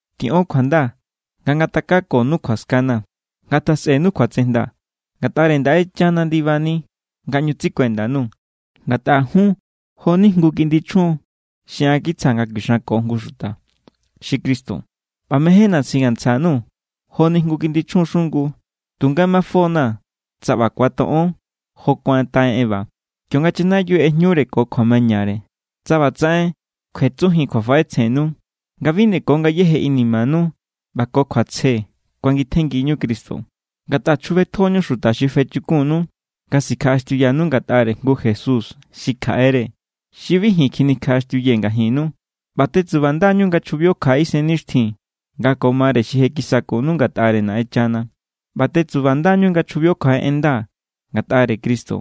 Tiꞌon kjuanda nga ngatakakonu kjuaskana̱. Ngatjasꞌenu kjuatsejnda. Ngatꞌare Naꞌenchana ndibani nga ꞌñu tsikuenda_nuu̱. Ngatꞌa jun jo=ni jngu kiꞌndi chjun xi an kitsjaa̱ nga kuixanko jngu xuta, xi Cristo. ꞌBa mejénna̱ singantsja_nuu̱ joni jngu kiꞌndi chjun xungu. Tunga mafo=na̱ tsa ꞌba ku̱atoꞌon jo kuataꞌen Eva, kionga chanayiu ꞌejñure ko kjuamañare, tsa ꞌbatsaꞌen kjuetsunjin kjuafaꞌetsjennu nga bi nde ko ngayéje inimanu ꞌba ko kjuatsje kuangitjenngiñu Cristo. Ngatꞌa chjubetjoñu xuta xi fechukunnu nga sikjaꞌaxtiuyanu ngatꞌare jngu Jesús xi kjaꞌere, xi bi ji̱n kjinikjaꞌaxtiuyee̱ ngajinnu. ꞌBa tetsubanda=ñu nga chjubio kjaꞌe isennixtjin nga ko mare xi je kisakunu ngatꞌare Naꞌenchana. ꞌBa tetsubanda=ñu nga chjubio kjaꞌe en nda ngatꞌare Cristo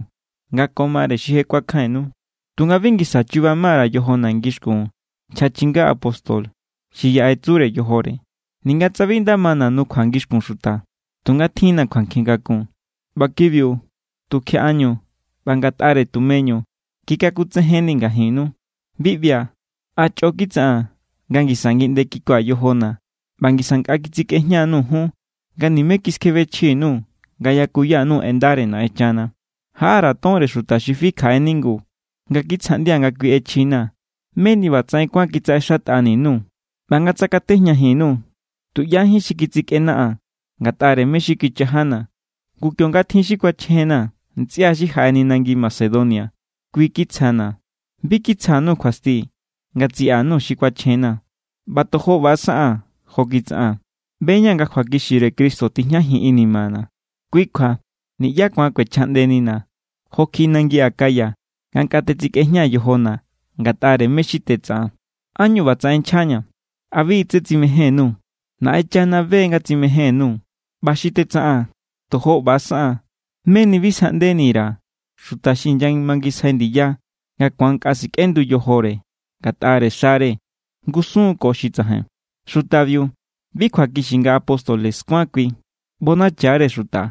nga ko mare xi je kuakjainnu. Tunga bi ngisa chuba ma_ra̱ yojona̱ ngixkun nchja chinga apóstobiu xi yaꞌe tsure yojore. Ninga tsa bi nda mana̱ nukjua ngixkun xuta, tunga tjin=na̱ kjuankjin kakun. ꞌBa kibiu tukjiaꞌañu ꞌba ngatꞌare tumeñu kikakutsejennii̱ ngajinnu. Bi ꞌbia̱, ¿a chꞌo kitsaꞌaa̱n nga ngisa ngiꞌnde kikua̱ yojona̱ ꞌba ngisa nkꞌa kitsikꞌejña_nuu̱ jun nga nimé kiskjebechji_nuu̱ nga yakuyanu en ndare Naꞌenchana? Jaꞌa_ra̱ tonre xuta xi fi kjaꞌe ningu nga kitsjaꞌndia̱ nga kui ꞌechjina̱, meni ꞌbatsaꞌen kuán kitsaꞌexatꞌani_nuu̱. ꞌBa nga tsakatejñajin_nuu̱, tuꞌyájín xi kitsikꞌenaꞌaa̱n ngatꞌare mé= xi kichajana̱. Ngu, kionga tjin xi kuachjena̱, ntsꞌia xi jaꞌeni nangi Macedonia kui kitsjana̱. Bi kitsja_nuu̱ kjuasti nga tsiꞌa_nuu̱ xi kuachjena̱, ꞌba tojo ꞌba= saꞌaa̱n jo kitsaꞌaa̱n. ꞌBe=ña̱ nga kjuakixire Cristo tijñajin inimana̱. Kui kjua niꞌyá ku̱an kꞌuechjaꞌndenina̱ jo kjiꞌi nangi Acaya nga nkꞌa tetsikꞌejñaa̱ yojona̱ ngatꞌare mé= xi tetsaꞌaa̱n. ¿Ánñu ꞌbatsaꞌen nchjaña̱? ¿A bi= tse tsimején_nuu̱? Naꞌenchana be= nga tsimején_nuu̱. ꞌBa xi tetsaꞌaa̱n, tojo ꞌba= saꞌaa̱n meni bi sjaꞌndeni_ra̱ xuta xi inyamangisjai ndiya nga ku̱an nkꞌa sikꞌendu yojore ngatꞌa xare ngusun= ko xi tsajain. Xutabiu, bi kjuakixi nga apóstoles kuán kui. ꞌBonacha=re xuta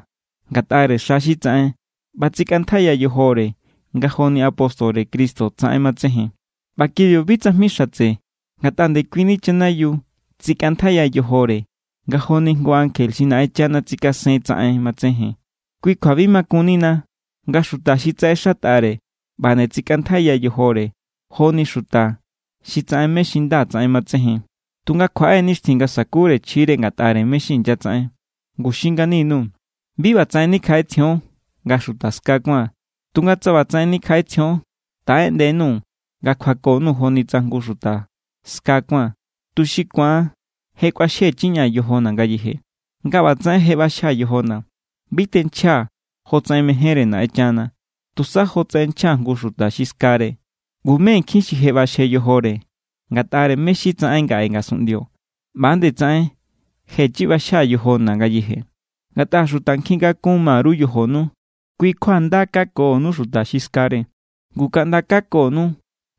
ngatꞌare xa xi tsaꞌen ꞌba tsikꞌantjaiya yojore nga joni apóstore Cristo tsaꞌen matsejen. ꞌBa kibiu bi tsajmi xatse, ngatꞌa ndekuini chanayiu tsikꞌantjaiya yojore nga joni jngu ankje xi Naꞌenchana tsikasen tsaꞌen matsejen. Kui kjua bi makunnina nga xuta xi tsaꞌexatꞌare ꞌba nde tsikꞌantjaiya yojore joni xuta xi tsaꞌen mé= xi nda tsaꞌen matsejen. Tunga kjuaꞌe= nixtjin nga sa̱kure chjire ngatꞌare mé= xi inyatsaꞌen. Ngu xin ngani_nuu̱: bi ꞌbatsaꞌen nikjaꞌetsjion nga xuta ska kuáa̱n. Tunga tsa ꞌbatsaꞌen nikjaꞌetsjion, taꞌeꞌndenuu̱ nga kjuako_nuu̱ joni tsa jngu xuta ska kuáa̱n, tuxi ku̱an je kꞌuaxjechiña̱ yojona̱ ngayeje. Nga ꞌbatsaꞌen je ꞌbaxjaa̱ yojona̱, bi tenchjaa̱ jotsaꞌen mejénre Naꞌenchana, tusa jotsaꞌen nchja jngu xuta xi skare. Ngu mé nkjin xi je ꞌbaxje yojore ngatꞌare mé= xi tsaꞌen ngaꞌe ngasunꞌndio, ꞌba nde tsaꞌen jechi ꞌbaxjaa̱ yojona̱ ngayeje. Ngatꞌa xuta nkjin kakun ma_ru yojonu, kui= kjua nda kakonu xuta xi skare. Ngu kaꞌnda kakonu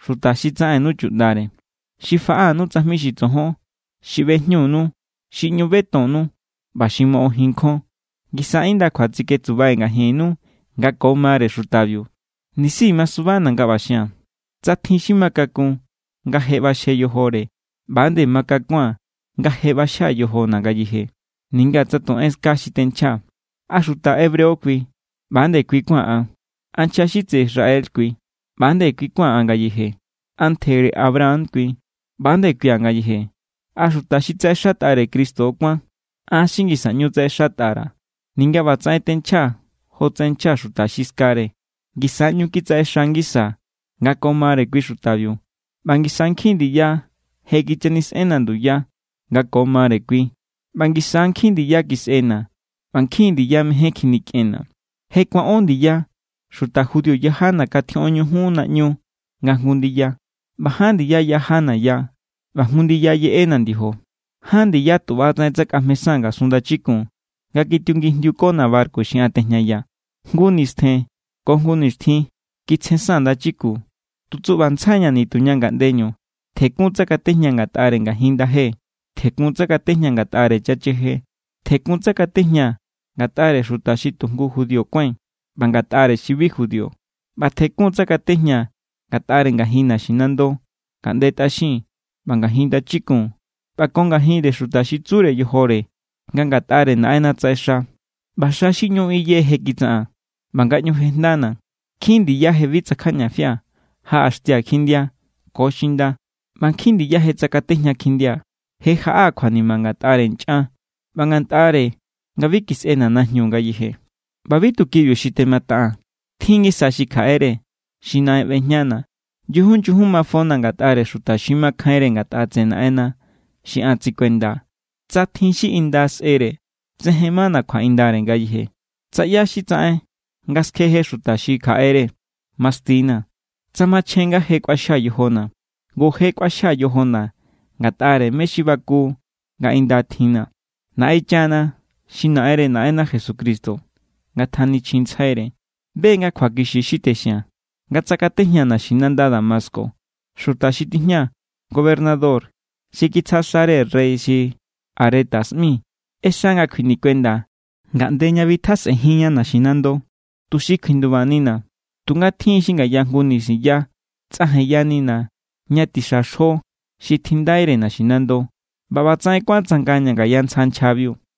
xuta xi tsaꞌennu chuꞌndare, xi faꞌanu tsajmi xi tsojon, xi ꞌbejñunu, xi ꞌñu betonnu, ꞌba xi moꞌojin nkjon. Ngisa indakjua tsiketsubai̱ ngajinnu nga ko mare xutabiu. Nisi masubana̱ nga ꞌba xia̱n. Tsa tjin xi ma kakun nga je ꞌbaxje yojore, ꞌba=nde makakua̱n nga je ꞌbaxjaa̱ yojona̱ ngayeje, ninga tsa tu enska xi tenchjaa̱. ¿A xuta Hebreo kui? ꞌBa=nde kui kuáa̱n an. ¿A nchja xi tseꞌe Israel kui? ꞌBa=nde kui kuáa̱n an ngayeje. ¿A ntjere Abraham kui? ꞌBa=nde kuia̱ ngayeje. ¿A xuta xi tsaꞌexatꞌare Cristo= kuán? An xi ngisa ꞌñu tsaꞌexatꞌare, ninga ꞌbatsaꞌen tenchjaa̱ jotsaꞌen nchja xuta xi skare. Ngisa ꞌñu kitsaꞌexa ngisaa̱ nga ko mare kui xutabiu, ꞌba ngisa nkjin ndiya je kichanisꞌenna̱ nduya nga ko mare kui, ꞌba ngisa= nkjin ndiya kisꞌena̱, ꞌba nkjin ndiya mején kjinikꞌenna̱. Je kuaꞌón ndiya xuta judío yajana̱ katjioꞌon ñujun naꞌñu nga jngu ndiya. ꞌBa ján ndiya yajana̱ ya, ꞌba jngu ndiya yeꞌena̱ ndiojo. Ján ndiya tu ꞌbatsaꞌen tsakꞌajmesaa̱n ngasun ndachikun nga kitiungijndiukona̱ barku xi an tejñayaa̱. Jngu nistjen ko jngu nixtjin kitsjensaa̱n ndachikun. Tu tsuꞌbantsjai=ña̱ nituña ngaꞌndeñu. Tjekun tsakatejñaa̱ ngatꞌare ngajin ndaje, tjekun tsakatejñaa̱ ngatꞌare chacheje, tjekun tsakatejñaa̱ ngatꞌare xuta xi tu jngu judío kuái̱n ꞌba ngatꞌare xi bi judío. ꞌBa tjekun tsakatejñaa̱ ngatꞌare ngajin naxinando, ngaꞌnde tꞌaxin, ꞌba ngajin ndachikun ꞌba ko ngajinre xuta xi tsure yojore nga ngatꞌare Naꞌenna tsaꞌexa. ꞌBa xa xi ꞌñu iye je kitsaꞌaa̱n ꞌba nga ꞌñu je jejndana̱. Nkjin ndiya je bi tsakjajñafia̱, jaꞌaxtia̱ kjindia ko xinda, ꞌba nkjin ndiya je tsakatejña kjindia̱. Je jaꞌaa̱ kjuanima ngatꞌare nchꞌan ꞌba ngatꞌare nga bi kisꞌena̱ najñu ngayeje. ꞌBa bi tu kibiu xi temataꞌaa̱n, tjin= ngisa xi kjaꞌere xi naꞌen ꞌbejñana̱. Nyujun, nyujun mafona̱ ngatꞌare xuta xi makjainre ngatꞌa tseꞌe Naꞌenna xi an tsikuendaa̱. Tsa tjin xi inda sꞌere, tsejen mana̱ kjuaꞌindare ngayeje. Tsa ꞌyá= xi tsaꞌen nga skjeje xuta xi kjaꞌere, masti=na̱. Tsa machjen nga je kꞌuaxjaa̱ yojona̱, ngu je kꞌuaxjaa̱ yojona̱ ngatꞌare mé= xi baku nga inda tjinna̱. Naꞌenchana, xi Naꞌenre Naꞌenna Jesucristo (ngatjanichjintsjaire) be= nga kjuakixi xi texia̱n. Nga tsakatejñaa̱ naxinanda Damasco, xuta xi tijña gobernador xi kitsja xare rey xi Aretas ꞌmi, ꞌexa nga kjuinikuenda ngaꞌnde ña bitjasꞌenjinña naxinando tuxi kjuindubanina̱. Tunga tjin xi ngaya jngu nisinya tsꞌajenyanina̱ ña tixa xjo xi tjindaire naxinando, ꞌba ꞌbatsaꞌen kuán tsangaña̱ ngaya ntsja nchjabiu.